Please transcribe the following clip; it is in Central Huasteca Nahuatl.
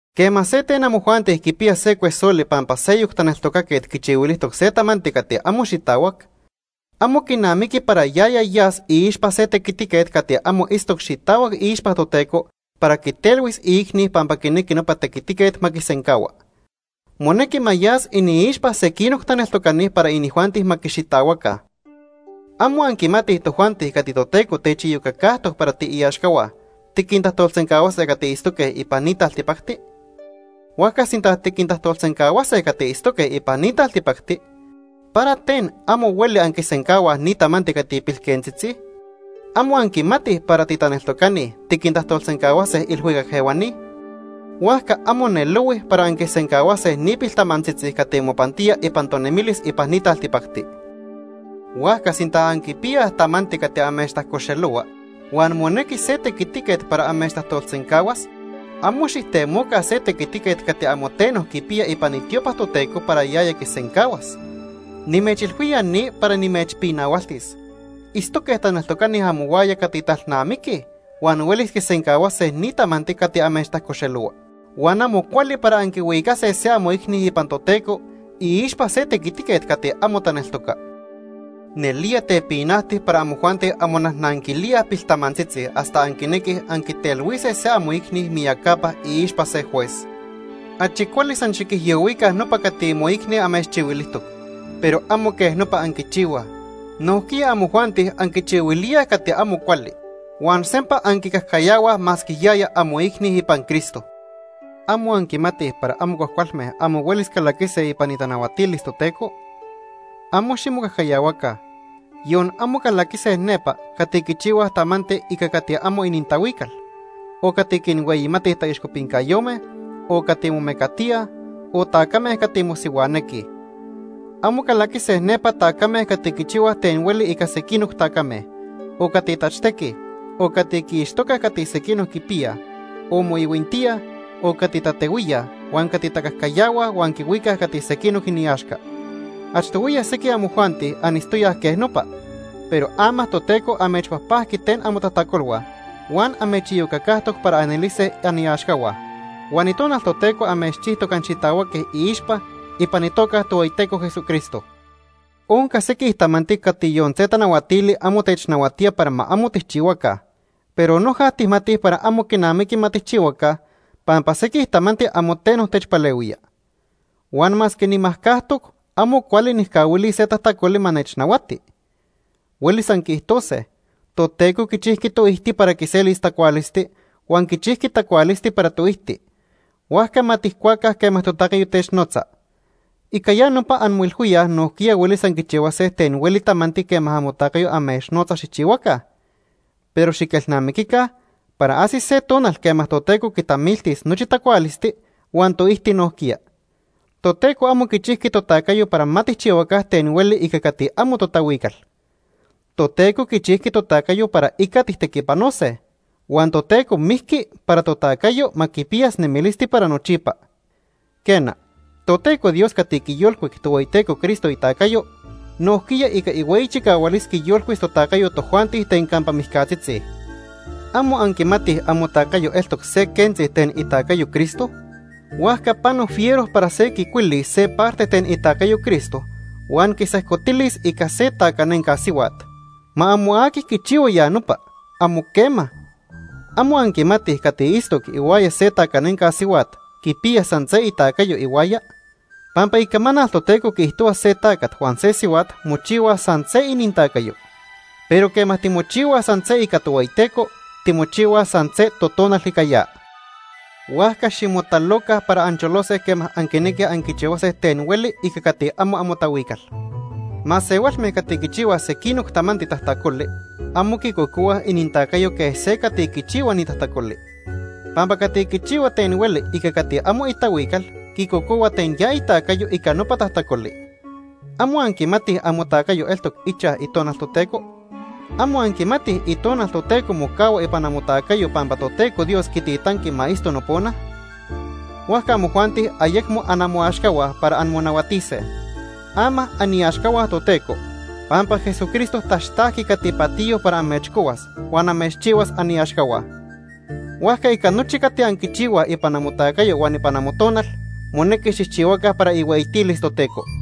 Quema se ten amojuanti quipiya se cuesoli pampa seyoc taneltocaquet quichihuilijtoc se tamanti cati amo xitahuac, amo quinamiqui para yaya yas iixpa se tequitiquet cati amo itztoc xitahuac iixpa Toteco para quitelhuis iicni pampa quinequi nopa tequitiquet ma quisencahua. Monequi ma yas iniixpa sequinoc taneltocani para inijuanti ma quixitahuaca. ¿Amo anquimatij tojuanti cati Toteco techiyocacajtoc para tiiaxcahua tiquintajtolsencahuase cati itztoque ipan ni taltipacti? Huajca, sinta tiquintajtolsencahuase cati itztoque ipan taltipacti, ¿para ten amo hueli anquisencahuaj ni tamanti cati pilquentzitzi? ¿Amo anquimatij para titaneltocani tiquintajtolsencahuase ilhuicac ehuani? Huajca amo nelohui para anquisencahuase ni piltamantzitzi cati mopantía ipan tonemilis ipan ni taltipacti. Huajca sinta anquipiyaj tamanti cati amechtajcoxelohua huan monequi se tequitiquet para amechtajtolsencahuas, amo xijtemoca se tequitiquet cati amo teno quipiya ipan itiopa Toteco para yaya quisencahuas. Nimechilhuía ni para nimechpinahualtis. Itztoque taneltocani amohuaya cati talnamiquij huan huelis quisencahuase ni tamanti cati amechtajcoxelohua. Huan amo cuali para anquihuicase se amoicni ipan Toteco iixpa se tequitiquet cati amo taneltoca. Nelía tepinajti para amojuanti anmonajnanquilíaj piltamantzitzi hasta anquinequij anquitelhuise se amoicni miyacapa iixpa se juez. Achi cuali san xiquijyohuica nopa cati moicni amechchihuilijtoc. Pero amo quej nopa anquichihuaj. Nojquiya amojuanti anquichihuilíaj cati amo cuali, huan sempa anquicajcayahuaj masque yaya amoicni ipan Cristo. ¿Amo anquimatij para amo cuajcualme amo huelis calaquise ipan itanahuatilis Toteco? ¡Amo ximocajcayahuaca! Yon amo calaquise nepa cati quichihuaj tamanti ica cati amo inintahuical, o cati quinhueyimatij taixcopincayome, o cati momecatíaj, o tacame cati mosihuanequij. Amo calaquise nepa tacame cati quichihuaj ten hueli ica sequinoc tacame, o cati tachtequij, o cati quiixtocaj cati sequinoc quipiyaj, o moihuintíaj, o cati tatehuíaj huan cati tacajcayahuaj huan quihuicaj cati sequinoc iniaxca. Achtohuiya sequij amojuanti anitztoyaj quej nopa, pero ama Toteco amechpajpajqui ten amotajtacolhua huan amechiyocacajtoc para anelise aniaxcahua. Huan Itonal Toteco amechchijtoc anxitahuaque iixpa ipan itoca Ica itequiticayo. Tohueyiteco Jesucristo. Onca sequij tamanti cati yon se tanahuatili amo technahuatía para ma amo tijchihuaca, pero noja tijmatij para amo quinamiqui ma tijchihuaca, pampa sequij tamanti amo teno techpalehuía. Huan masque nimajcajtoc, amo cuali nijcahuilis se tajtacoli ma nechnahuati. Huelis anquiijtose: “Toteco quichijqui toijti para quiselis tacualisti huan quichijqui tacualisti para toijti, huajca ma tijcuaca quema totacayo technotza.” Ica ya nopa anmoilhuíaj nojquiya huelis anquichihuase ten hueli tamanti quema amotacayo amechnotza xijchihuaca, pero xiquelnamiquica para ajsis se tonal quema Toteco quitamiltis nochi tacualisti huan toijti nojquiya. Toteco amo quichijqui totacayo para ma tijchihuaca ten hueli ica cati amo totahuical. Toteco quichijqui totacayo para ica tijtequipanose, huan Toteco mijqui para totacayo ma quipiyas nemilisti para nochipa. Quena, Toteco Dios cati quiyolcuic Tohueyiteco Cristo itacayo, nojquiya ica ihueyi chicahualis quiyolcuis totacayo tojuanti ten campa mijcatzitzi. ¿Amo anquimatij amotacayo eltoc se quentzi ten itacayo Cristo? Huajca pano fiero para se quicuilis se parte ten itacayo Cristo huan quisejcotilis ica se tacanenca sihuat. Ma amo aqui quichihua ya nopa, amo quema. ¿Amo anquimatij cati itztoc ihuaya se tacanenca sihuat quipiya san se itacayo ihuaya? Pampa Icamanal Toteco quiijtohua se tacat huan se sihuat mochihuaj san se inintacayo. Pero quema timochihuaj san se ica Tohueyiteco, timochihuaj san se totonal ica ya. Huajca ximotaloca para ancholose quema anquinequij anquichihuase ten hueli ica cati amo amotahuical. Masehualme cati quichihuaj sequinoc tamanti tajtacoli amo quicocohuaj inintacayo quej se cati quichihua ni tajtacoli. Pampa cati quichihua ten hueli ica cati amo itahuical quicocohua ten ya itacayo ica nopa tajtacoli. ¿Amo anquimatij amotacayo eltoc ichaj Itonal Toteco? ¿Amo anquimatij Itonal Toteco mocahua ipan amotacayo pampa Toteco Dios quititanqui ma itzto nopona? Huajca amojuanti ayecmo anamoaxcahua para anmonahuatise. Ama aniaxcahua Toteco, pampa Jesucristo taxtajqui cati patiyo para amechcohuas huan amechchihuas aniaxcahua. Huajca ica nochi cati anquichihuaj ipan amotacayo huan ipan amotonal, monequi xijchihuaca para ihueyitilis Toteco.